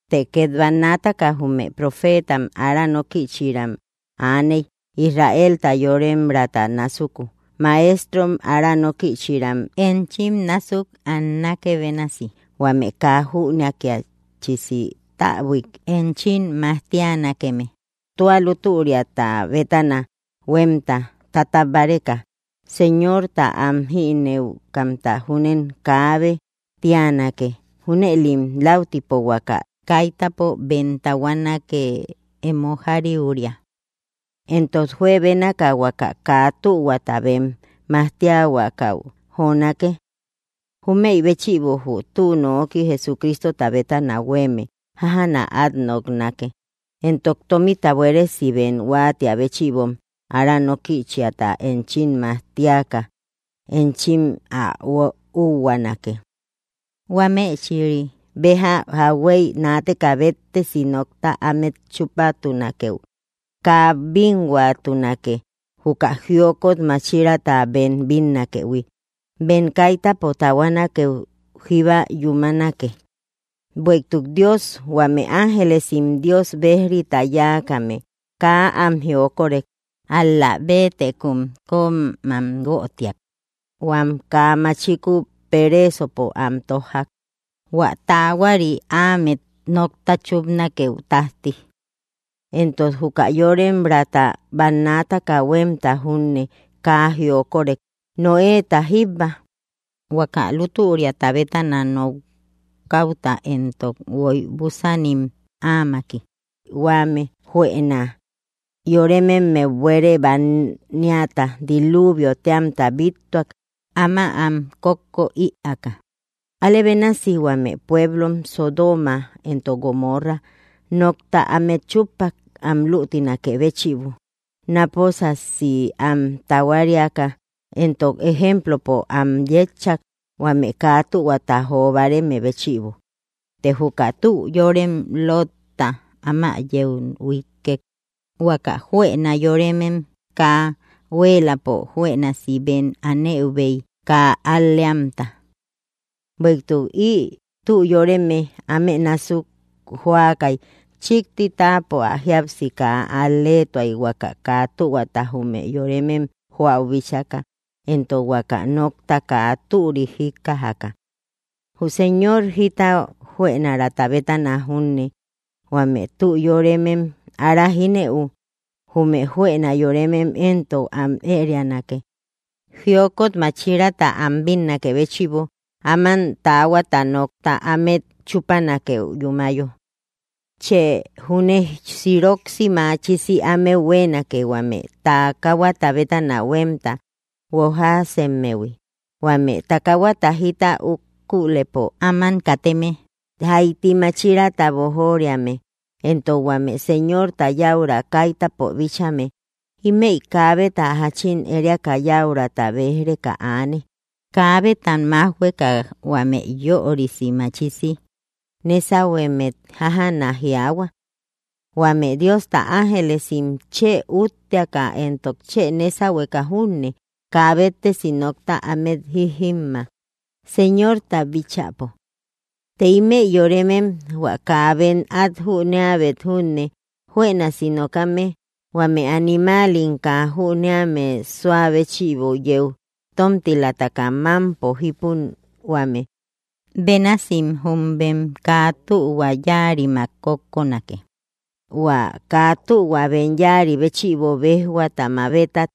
Të két bannaataka jume profeetam ára nókïchïram aaney Israelta yoremraata násuku, maestrom ára nókïchïram enchim násuk annákë bénasi, huame kaa jünakiachisi täbuik enchim majtianakeme, hua tua lútüriata bétana huémta tatabbáreka. Señorta am jínëukamta júnem kaabë tíanake, junëlim läutipo huaka kaitäpo bem tahuanake emo jariuria. Éntok juebénaka huaka kaa tühuata bem majtiahuakau jonake. Júmëi béchïbo jü tü nooki Jesucristota bétana huéeme jájana át noknake. Éntok tómita buéresi bem huáatiä béchïbom ára nókïchiata enchim majtiaka enchim ä úhuaanake. Huámechïri béja jauhuey naateka béttesi nokta ámet chúpatunakeu kaa bínhuatunake, juka jiokot máchiraata bem bínnakëhui, bem kaitäpo tahuanakeu jíba yúmanake. Bueïtuk Dios huame ángelesim Dios bejrita yáakame kaa am jiokorek, ál‑la béetekum kömam guötiak huam kaa machiku pereesopo am tójjak, hua taahuari ámet nokta chúpanakeu tájti. Éntok juka yoremraata bannaataka huémta júne kaa jiokorek, Noéta jíbba, huaka lútüriata bétana nokäuta éntok guoy búsanim áamaki; huame juëna yórememmeu buere bániata, diluvio téamta, bíttuak áma am kókko ïaaka. Alë bénasi huame pueblom Sodoma éntok Gomorra nokta ámet chúppak am luutinakë béchïbo, náposasi am tahuariaka, éntok ejemplopo am yétchak, huame kaa tühuata jo báareme béchïbo. Të juka tü yórem Lotta áma yeu huíkkek, huaka juëna yóremem kaa huéeläpo juënasi bem anëubei kaa al‑leamta. Bueïtuk ï tü yóreme áme násuk jóakay chíkti táapo ä jíapsi kaa al‑leetuay huaka kaa tühuata jume yoremem joäu bíchaka éntok huaka nokta kaa türik jíkkajaka. Jü Señor jita juënarata bétana júne huame tü yóremem ára jínëu, jume juëna yóremem éntok am ërianake jiokot máchiraata am bínnakë béchïbo áman taahuata nokta ámet chúpanakeu yúmayo. Chë júne siroksi machisi ámeu huéenake huame takahuata bétana huémta guojaasemmehui, huame takahuata jita ukulëpo áman kateme, jaiti máchiraata boojoriame, éntok huame Señorta yäura kaitäpo bíchame. Ímëi kaabeta jáchin ériaka yäurata béj‑reka aane, kaabetam májhueka huame yörisi machisi nésahuemmet jájana jiaahua. Huame Diosta ángelesim chë útteaka éntok chë nésahueka junne kaa béttesi nokta ámet jíjimma, Señorta bíchäpo. Të ímëi yoremem hua kaa bem át jüneäubet júne juënasi nokame, huame animal kaa jüneame súa béchïbo yeu tómtilamtaka mámpo jípuhuame bénasim jum bem kaa tühua yáarimmak kókkonake, hua kaa tühua bem yáari béchïbo béjhuata mabetak,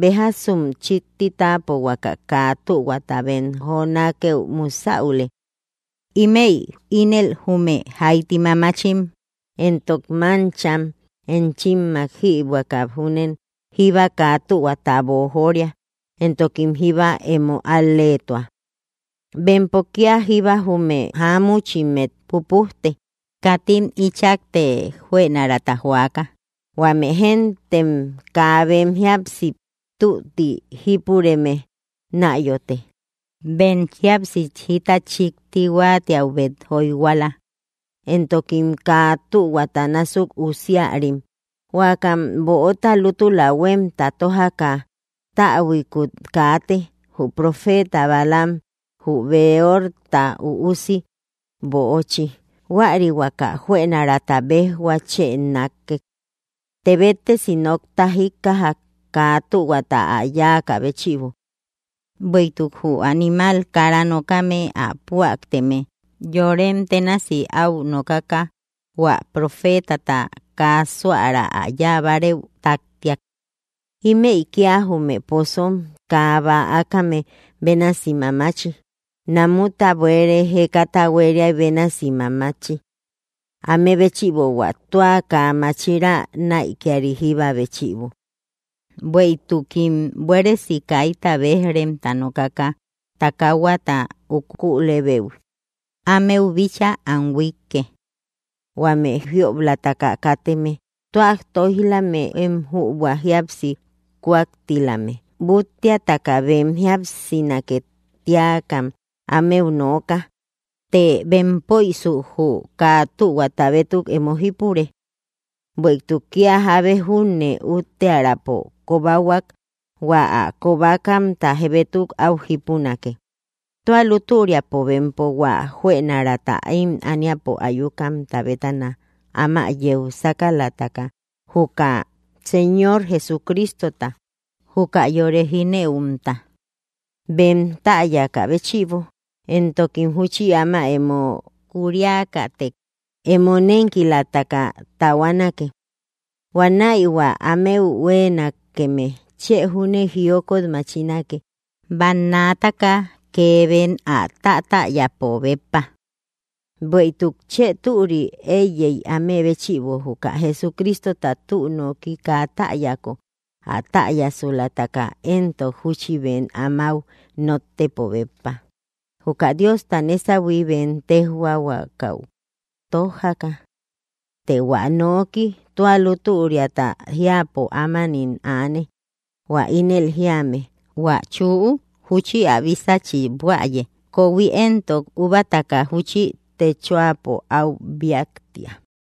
béjasum chíkti táapo huaka kaa tühuata bem jonakeu musäule. Ímëi ínel jume jaiti mamachim, éntok máncham, enchimmak jïbuäka júnen jíba kaa tühuata boojoria, éntokim jíba emo al‑leetua. Bempo kía jíba jume jáamuchimmet pupujte, katim íchakte juënarata joaka, huame géntem kaa bem jíapsi tútti jípureme náyote. Bem jíapsi jita chíkti huáatiaubet jóyhuala, éntokim kaa tühuata násuk usiarim. Huakam böota lútula huémta tójaka täbuikut kaate, jü profeta Balaam jü Beorta üusi böochi, huäri huaka juënaraata béjhua chë nákkek. Të béttesi nokta jíkkajak kaa tühuata ä yáakä béchïbo; bueïtuk jü animal kara nokame ä püaateme yorem ténasi áu nokaka hua profetata kaa súara ä yáa bárëu táktiak. Ímëi kía jume pozom kaa bäakame bénasi mamachi, namuta buere jékata huéria bénasi mamachi; áme béchïbo hua tua kaa máchira näikiari jíba béchïbo. Bueïtukim buéresi kaita béj‑remta nokaka takahuata ukulëubei ámeu bíchaa am huiike, huame jiob‑lataka kateme tua tóij‑lame én jübua jíapsi kúaktilame. Búttiataka bem jíapsinake tíakam ámeu nooka, të bempöisu jü kaa tühuata bétuk emo jípure. Bueïtuk kía jábe júne úttearäpo kobahuak hua ä kobakamta bétuk áu jípunake. Tua lútüriapo bempo hua juënaraata ím ániapo ayukamta bétana áma yeu sákalataka, juka Señor Jesucristota, juka yore jínëumta, bem täyaka béchïbo, éntokim júchi áma emo kuuriakätek emo nénkilamtaka tahuanake. Huanäi hua ámeu huéenakeme chë júne jiokot machinake bannaataka kee bem ä tátäyäpo béppa. Bueïtuk chë türi éiyey áme béchïbo juka Jesucristota tü noki kaa täyako, ä täyasulataka éntok júchi bem amáu nóttëpo béppa, juka Diosta nésahui bem téjhuahuakau tójaka. Të hua noki tua lútüriata jiäpo ámanim aane, hua ínel jíame: “Huä chüu júchi ä bísachi buäye, kohui éntok úbataka júchi techoapo áu bíaktia.”